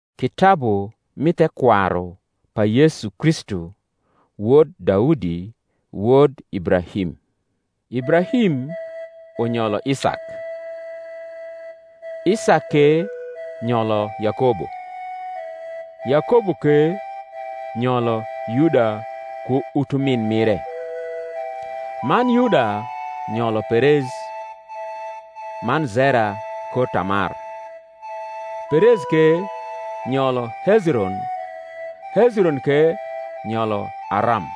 Kitabu mi thekwaru pa Yesu Kristu, wod Daudi, wod Ibrahim. Ibrahim uuyolo Isak; Isak ke nyolo Yakobo; Yakobo ke nyolo Yuda ku utumin mire; man Yuda nyolo Perez man Zera kor Tamar; Perez ke nyolo Hezron; Hezron ke nyolo Aram;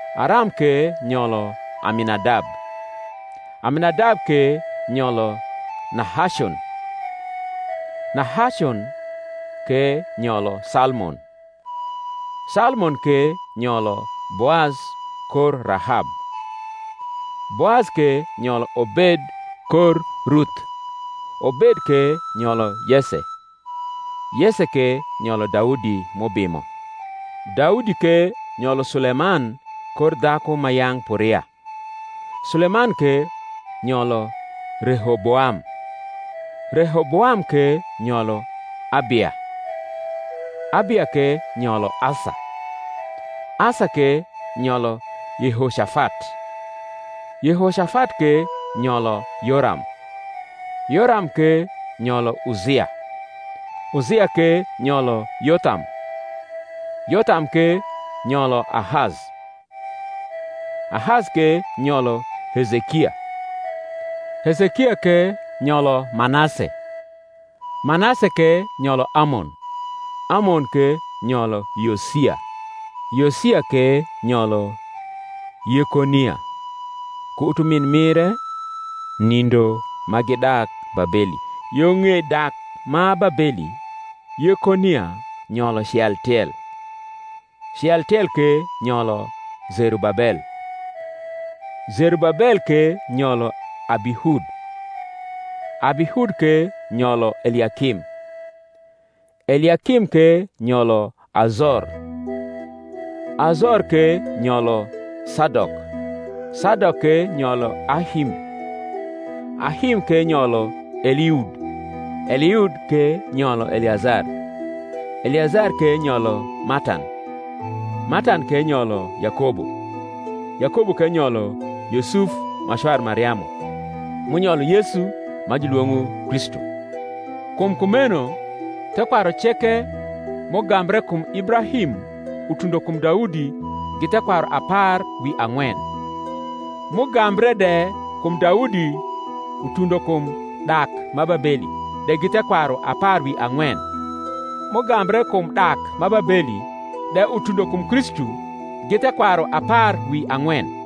Aram ke nyolo Aminadab; Aminadab ke nyolo Nahacon; Nahacon ke nyolo Salmon; Salmon ke nyolo Boaz kor Rahab; Boaz ke nyolo Obed kor Ruth; Obed ke nyolo Yese; Yese ke nyolo Daudi m’ubimo. Daudi ke nyolo Suleman kor dhaku ma yang’ p’Uria; Suleman ke nyolo Rehoboam; Rehoboam ke nyolo Abia; Abia ke nyolo Asa; Asa ke nyolo Yehocafat; Yehocafat ke nyolo Yoram; Yoram ke nyolo Uzia; Uzia ke nyolo Yotham; Yotham ke nyolo Ahaz; Ahaz ke nyolo Hezekia; Hezekia ke nyolo Manase; Manase ke nyolo Amon; Amon ke nyolo Yosia; Yosia ke nyolo Yekonia ku utumin mire nindo ma gidak Babeli. Yo ng’ei dak ma Babeli Yekonia nyolo Cealtiel; Cealtiel ke nyolo Zerubabel; Zerubabel ke nyolo Abihud; Abihud ke nyolo Eliakim; Eliakim ke nyolo Azor; Azor ke nyolo Sadok; Sadok ke nyolo Ahim; Ahim ke nyolo Eliud; Eliud ke nyolo Eleazar; Eleazar ke nyolo Matan; Matan ke nyolo Yakobo; Yakobo ke nyolo Yusuf ma cwar Mariamu, m’unyolo Yesu, ma julwong’o Kristu. Kum kumeno thekwaru ceke m’ugambre kum Ibrahim utundo kum Daudi gi thekwaru apar wi ang’wen; m’ugambre de kum Daudi utundo kum dak ma Babeli de gi thekwaru apar wi ang’wen; m’ugambre kum dak ma Babeli de utundo kum Kristu gi thekwaru apar wi ang’wen.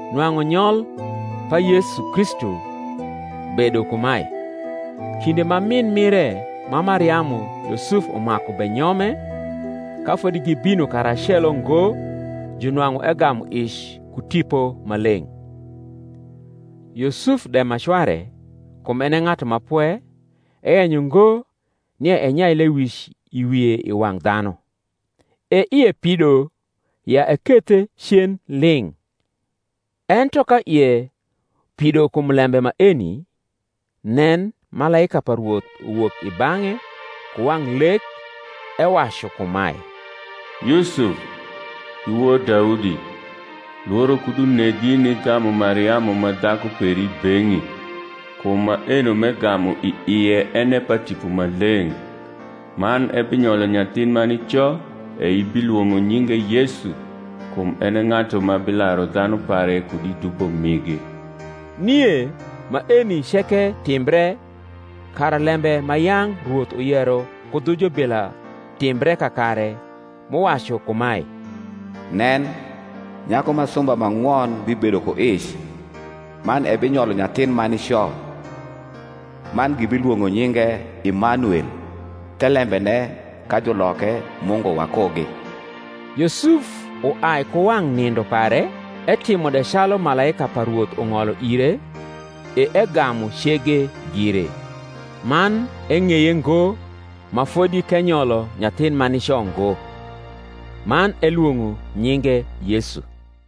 Nwang’u nyol pa Yesu Kristu bedo kumae; Kinde ma min mire ma Mariamu Yusuf umaku benyome, ka fodi gibino karacelo ngo junwang’u egamu ic ku Tipo Maleng’. Yusuf de ma cware, kum en e ng’atu ma pwe, eyenyo ngo nia enyai lewic i wie i wang’ dhanu, e ie pido ya ekethe cen ling’. Ento ka ie pido kum lembe maeni, nen, malaika pa Rwoth uwok i bang’e ku wang’ lek ewacu kumae, Yusuf, i wod Daudi, lworo kud unegi nigamu Mariamu ma dhaku peri i beng’i: kum maeno m’egamu i ie en e pa Tipo Maleng’. Man ebinyolo nyathin ma nico; e ibilwong’o nyinge Yesu; kum en e ng’atu ma bilaru dhanu pare kud i dubo migi. Nie maeni ceke timbre, kara lembe ma yang’ Rwoth uyero ku dhu jubila timbre kakare, m’uwacu kumae, Nen, nyaku ma sumba ma ng’won bibedo ku ic, man ebinyolo nyathin ma nico, Man gibilwong’o nyinge Imanuel; thelembene, ka juloke, Mungu wakugi. Yusuf uai ku wang’ nindo pare, etimo de calu malaika pa Rwoth ung’olo ire, e egamu cege gire; man eng’eye ngo ma fodi k’enyolo nyathin ma nico ngo: man elwong’o nyinge Yesu.